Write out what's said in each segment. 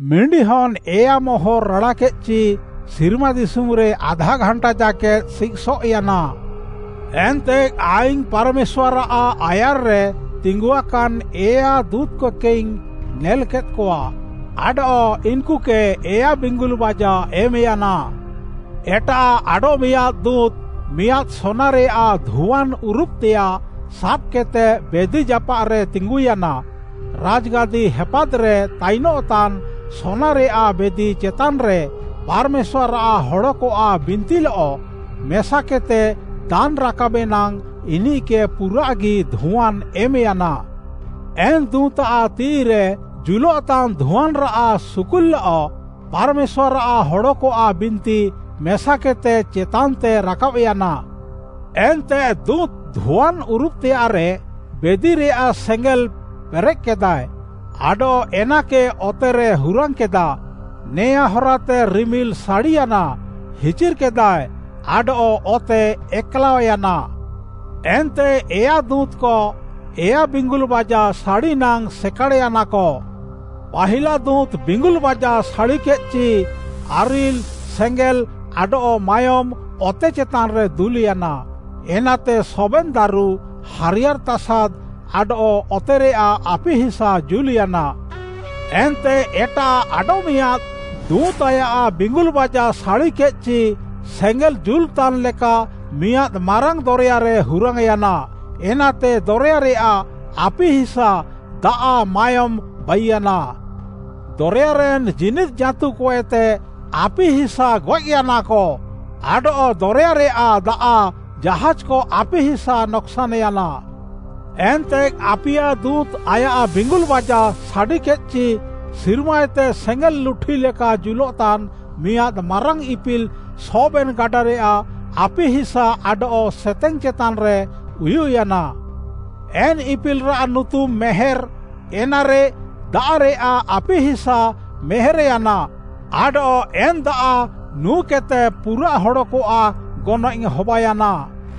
ମିଣ୍ଡିହନ୍‌ ଏୟା ମୋହର୍‌ ରାଡ଼ାକେଦ୍‌ଚି, ସିର୍ମା ଦିଶୁମ୍‌ରେ ଆଧା ଘାଣ୍ଟା ଜାକେଦ୍‌ ସିଃସଏଃୟାନା। ଏନ୍ତେ ଆଇଙ୍ଗ୍‌ ପାର୍‌ମେଶ୍ୱାର୍‌ଆଃ ଆୟାର୍‌ରେ ତିଙ୍ଗୁଆକାନ୍‌ ଏୟା ଦୁଁତ୍‌କକେଇଙ୍ଗ୍‌ ନେଲ୍‌କେଦ୍‌କଆ ଆଡଃ ଇନ୍‌କୁକେ ଏୟା ବିଙ୍ଗୁଲ୍‌ବାଜା ଏମ୍‍ୟାନା। ଏଟାଃ ଆଡଃମିଆଁଦ୍‌ ଦୁଁତ୍‌ ମିଆଁଦ୍‌ ସୋନାରେୟାଃ ଧୁଆନ୍‌ ଉରୁବ୍‌ତେୟାଃ ସାବ୍‌କେଦ୍‌ତେ ବେଦି ଜାପାଃରେ ତିଙ୍ଗୁୟାନା। ରାଜ୍‌ଗାଦି ହେପାଦ୍‌ରେ ତାଇନଃତାନ୍‌ ସୋନାରେୟାଃ ବେଦି ଚେତାନ୍‌ରେ ପାର୍‌ମେଶ୍ୱାର୍‌ଆଃ ହଡ଼କଆଃ ବିନ୍ତିଲଃ ମେସାକେଦ୍‌ତେ ଦାନ୍‌ ରାକାବେ ନାଙ୍ଗ୍‌ ଇନିଃକେ ପୁରାଃଗି ଧୁଆନ୍‌ ଏମ୍‌ୟାନା। ଏନ୍ ଦୁଁତ୍‌ଆଃ ତିଃଇରେ ଜୁଲଃତାନ୍‌ ଧୁଆନ୍‌ରାଃ ସୁକୁଲ୍‌ଲଃ ପାର୍‌ମେଶ୍ୱାର୍‌ଆଃ ହଡ଼କଆଃ ବିନ୍ତି ମେସାକେଦ୍‌ତେ ଚେତାନ୍‌ତେ ରାକାବ୍‌ୟାନା। ଏନ୍ତେ ଦୁଁତ୍‌ ଧୁଆନ୍‌ ଉରୁବ୍‌ତେୟାଃରେ ବେଦିରେୟାଃ ସେଙ୍ଗେଲ୍‌ ପେରେଃକେଦାଏ ଆଡଃ ଏନାକେ ଅତେରେ ହୁରାଙ୍ଗ୍‌କେଦା। ନେଆଁ ହରାତେ ରିମିଲ୍‌ ସାଡ଼ିୟାନା, ହିଚିର୍‍କେଦାଏ ଆଡଃ ଅତେ ଏକ୍‌ଲାଅୟାନା। ଏନ୍ତେ ଏୟା ଦୁଁତ୍‌କ ଏୟା ବିଙ୍ଗୁଲ୍‌ବାଜା ସାଡ଼ି ନାଙ୍ଗ୍‌ ସେକାଡ଼୍‌ୟାନାକ। ପାହିଲା ଦୁଁତ୍‌ ବିଙ୍ଗୁଲ୍‌ବାଜା ସାଡ଼ିକେଦ୍‌ଚି ଆରିଲ୍‌, ସେଙ୍ଗେଲ୍‌ ଆଡଃ ମାୟୋମ୍‌ ଅତେ ଚେତାନ୍‌ରେ ଦୁଲ୍‌ୟାନା। ଏନାତେ ସବେନ୍‌ ଦାରୁ, ହାରିୟାର୍‌ ତାସାଦ୍‌ ଆଡଃ ଅତେରେୟାଃ ଆପିହିସା ଜୁଲ୍‌ୟାନା। ଏନ୍ତେ ଏଟାଃ ଆଡଃମିଆଁଦ୍‌ ଦୁଁତ୍‌ ଆୟାଃ ବିଙ୍ଗୁଲ୍‌ବାଜା ସାଡ଼ିକେଦ୍‌ଚି ସେଙ୍ଗେଲ୍‌ ଜୁଲ୍‌ତାନ୍‌ ଲେକା ମିଆଁଦ୍‌ ମାରାଙ୍ଗ୍‌ ଦରେୟାରେ ହୁରାଙ୍ଗ୍‌ୟାନା। ଏନାତେ ଦରେୟାରେୟାଃ ଆପିହିସା ଦାଆଃ, ମାୟୋମ୍‌ ବାଇୟାନା। ଦରେୟାରେନ୍‌ ଜୀନିଦ୍‌ ଜାଁତୁକଏତେ ଆପିହିସା ଗଏଃୟାନାକ, ଆଡଃ ଦରେୟାରେୟାଃ ଦାଆଃ ଜାହାଜ୍‌କ ଆପିହିସା ନକ୍‌ସାନ୍‌ୟାନା। ଏନ୍ତେ ଆପିୟା ଦୁଁତ୍‌ ଆୟାଃ ବିଙ୍ଗୁଲ୍‌ବାଜା ସାଡ଼ିକେଦ୍‌ଚି ସିର୍ମାଏତେ ସେଙ୍ଗେଲ୍‌ ଲୁଠି ଲେକା ଜୁଲଃତାନ୍‌ ମିଆଁଦ୍‌ ମାରାଙ୍ଗ୍‌ ଇପିଲ୍‌ ସବେନ୍‌ ଗାଡ଼ାରେୟାଃ ଆପିହିସା ଆଡଃ ସେତେଙ୍ଗ୍‌ ଚେତାନ୍‌ରେ ଉୟୁଃୟାନା। ଏନ୍ ଇପିଲ୍‌ରାଃ ନୁତୁମ୍‌ “ମେହେର୍‌।” ଏନାରେ ଦାଆଃରେୟାଃ ଆପିହିସା ମେହେର୍‌ୟାନା, ଆଡଃ ଏନ୍‌ ଦାଆଃ ନୁଁକେଦ୍‌ତେ ପୁରାଃ ହଡ଼କଆଃ ଗନଏଃ ହବାୟାନା।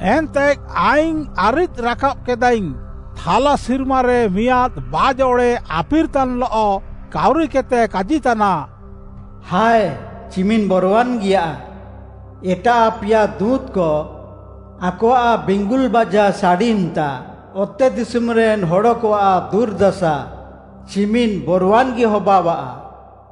ଏନ୍ତେ ଆଇଙ୍ଗ୍‌ ଆରିଦ୍‌ ରାକାବ୍‌କେଦାଇଙ୍ଗ୍‌, ଥାଲା ସିର୍ମାରେ ମିଆଁଦ୍‌ ବାଜ୍‌ ଅଡ଼େ ଆଫିର୍‌ତାନ୍‌ଲଃ କାଉରିକେଦ୍‌ତେ କାଜିତାନା, “ହାଏ, ଚିମିନ୍‌ ବରୱାନ୍‌ଗିୟା! ଏଟାଃ ଆପିୟା ଦୁଁତ୍‌କ ଆକଆଃ ବିଙ୍ଗୁଲ୍‌ବାଜା ସାଡ଼ି ଇମ୍‌ତା, ଅତେଦିଶୁମ୍‌ରେନ୍‌ ହଡ଼କଆଃ ଦୁର୍‌ଦାସା ଚିମିନ୍‌ ବରୱାନ୍‌ଗି ହବାଅଃଆ।”